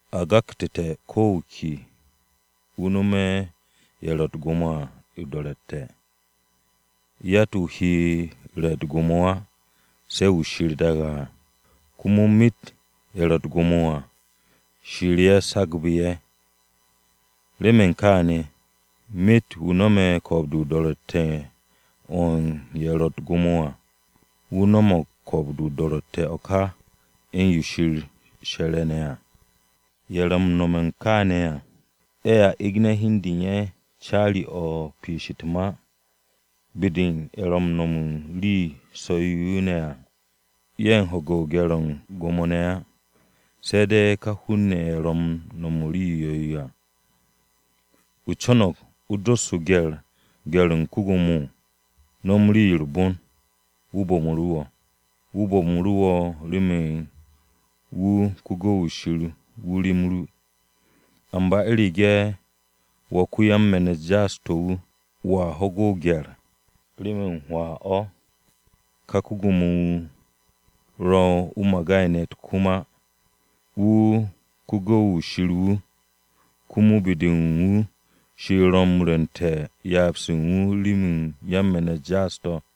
A gaktu̱te̱ ko̱ wu̱ ke wu̱ no̱me̱ ye̱ ro̱ u̱t-gwo̱mo à o-do̱ro̱tte̱. Yatt-wu̱ he re̱ u̱t-gwo̱mo á, se̱ wu̱ Shir daage̱ à. Komo myet ye̱ ro̱ u̱t-gwo̱mo à, Shir ye̱ sagbu̱ ye̱. Remen kaane̱, myet wu̱ no̱me̱ ko̱o̱b-de o-do̱ro̱tte̱ o̱ u̱n ye̱ ro̱ u̱t-gwo̱mo à, wu̱ no̱mo̱g ko̱o̱b-de o-do̱ro̱tte̱ o̱ ka u̱n yo Shir she̱re̱ ne̱ à. Ye̱ ro̱ m-no̱m kaane̱ à, ye̱a egne̱ hi u̱n de u̱n ye̱ caari-o̱ u̱n piish u̱t-ma. Be-de u̱n ye̱ ro̱ m-no̱m u̱n u̱n rii so̱-yo ne̱ à, ye̱ m-ho̱ge̱ gye̱r-o̱ u̱n gwo̱mo-ne̱ á, se̱ de̱ ka hun-ne̱ ye̱ ro̱ u̱n m-no̱m u̱n rii 'yo̱-yo à. ¿O co̱no̱g o dos gye̱r-o̱ u̱n ko-Gwo̱mo? No̱m rii-yo u̱r-bon, wu̱ bo̱mu̱ru̱ wo̱. Wu̱ bo̱mu̱ru̱ wo̱ remen wu̱ ko-gu̱w-wu̱ Shir wu̱ rem ru. Amba u̱rege̱ wo̱ ko-yan-me̱n-u̱t jaas-to̱ wu̱, wo̱a ho̱ge̱ o-gye̱r, remen hwaa-o̱ ka ko-gwo̱mo-wu̱ ro̱ o-magay ne̱ u̱t-kom á. Wu̱ ko-gu̱w-wu̱ Shir wu̱, komo be-de u̱n wu̱ Shir ro̱ m-rwu̱nte̱ u̱n ryaab-se wu̱ remen yan-me̱n-u̱t jaas-to̱.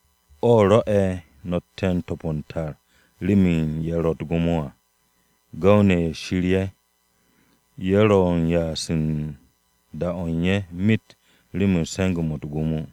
O̱ rwo̱'e̱ no̱tte̱ u̱n to̱p u̱n tar, remen ye̱ ro̱ u̱t-gwo̱mo à, gu̱w-ne̱ ye̱ Shir ye̱. Ye̱ ro̱ u̱n ya'as u̱n da-o̱ u̱n ye̱ myet remen se̱nge̱-mo̱ u̱t-gwo̱mo.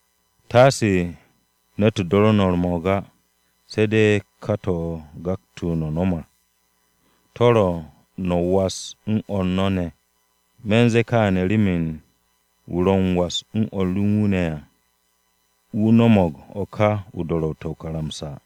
Taase ne̱t do̱ru̱ no̱ u̱r-mo̱o̱g á. Se̱ de̱ ka yo a gaktu̱ no̱ m-nom à, yo ro̱ no̱ was u̱n o̱r no̱ ne̱ ne̱. Me̱ u̱n ze̱e̱ kaane̱ remen wu̱ ro̱ m-was u̱n o̱r u̱n wu̱ ne̱ à, wu̱ no̱mo̱g o̱ ká do̱ro̱tte̱ o-karamsa.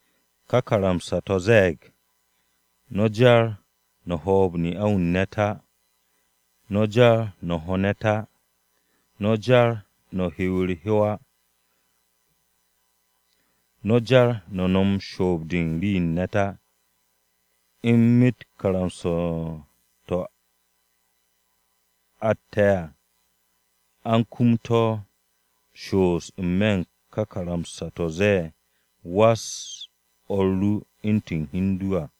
Ka karamsa-to̱ ze̱e̱g, “No̱ jar no̱ hoob ne'a-wu̱ u̱n ne̱t á. No̱ jar no̱ ho ne̱t á. No̱ jar no̱ hiw u̱r-hyow á. No̱ jar no̱ no̱m shoob-de rii-yo u̱n ne̱t á.” U̱n myet karamsa-to̱ atte̱ à, a u̱n kum to̱ m-shoos n-me̱ u̱n ka ma-to̱ ze̱e̱, “Was o̱r ru u̱ntu̱n hi u̱n du à.”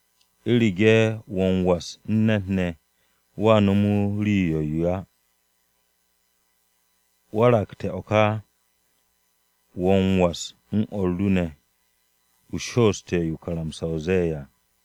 U̱rege̱ wo̱ m-was u̱n ne̱t ne̱, wo̱a no̱me̱ wu̱ rii 'yo̱-yo á. Waragte̱ o̱ ka, wo̱ m-was u̱n o̱r ru ne̱, o shooste̱ yo o-karamsa ze̱e̱ à.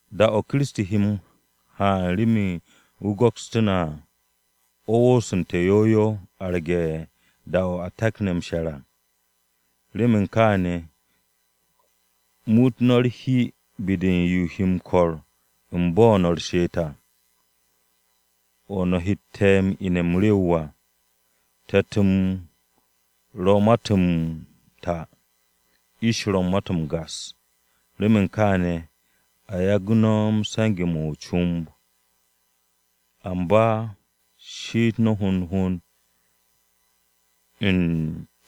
Da-o̱ Kiristi he m-haan remen wu̱ go̱kstú̱ na à, o̱ wosonte̱ yow yow arge̱ u̱n da-o̱ a takne̱ m-she̱r à. Remen kaane̱, muut no̱ u̱r-hi be-de yo he m-ko̱r u̱n bo̱ no̱ she'et à. O̱ no̱ hette̱ ine̱ m-rew à. Te̱t-m ro̱ u̱n ma-to̱ m-ta, ish ro̱ u̱n ma-to̱ m-gas. Remen kaane̱, a yagu̱ no̱ se̱nge̱-mo̱ o-comb. Amba she'et no̱ hond hond u̱n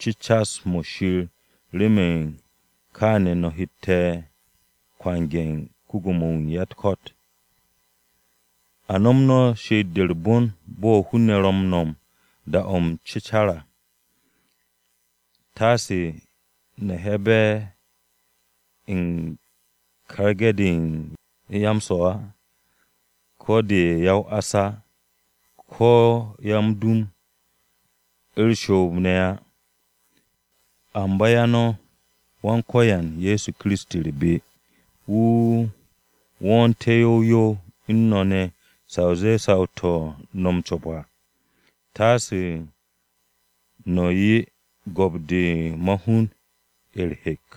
cecas-mo̱ Shir remen kaane̱ no̱ hette̱ kwange̱ ko-Gwo̱mo-wu̱ u̱n ya-u̱t-ko̱t. A she'et no̱ she'et-de u̱r-bon bo̱ hun-ne̱ ro̱ m-she'et da-o̱ m-cecar à. Taase no̱ he̱'e̱be̱ u̱n karge̱ de ya-m-swo̱ á, ko̱ de ya-o-ás á, ko̱ ya-m-dum, u̱r-shoob ne̱ á. Amba 'ya no̱ Wan-Ko̱yan Ye̱so Kiristi u̱r-be wu̱ wo̱o̱nté̱ yow yow u̱n no̱ ne̱ sa o zee saw-to̱ no̱ m-co̱p à. Taase no̱ 'ye go̱p-de ma-hun u̱r-hek.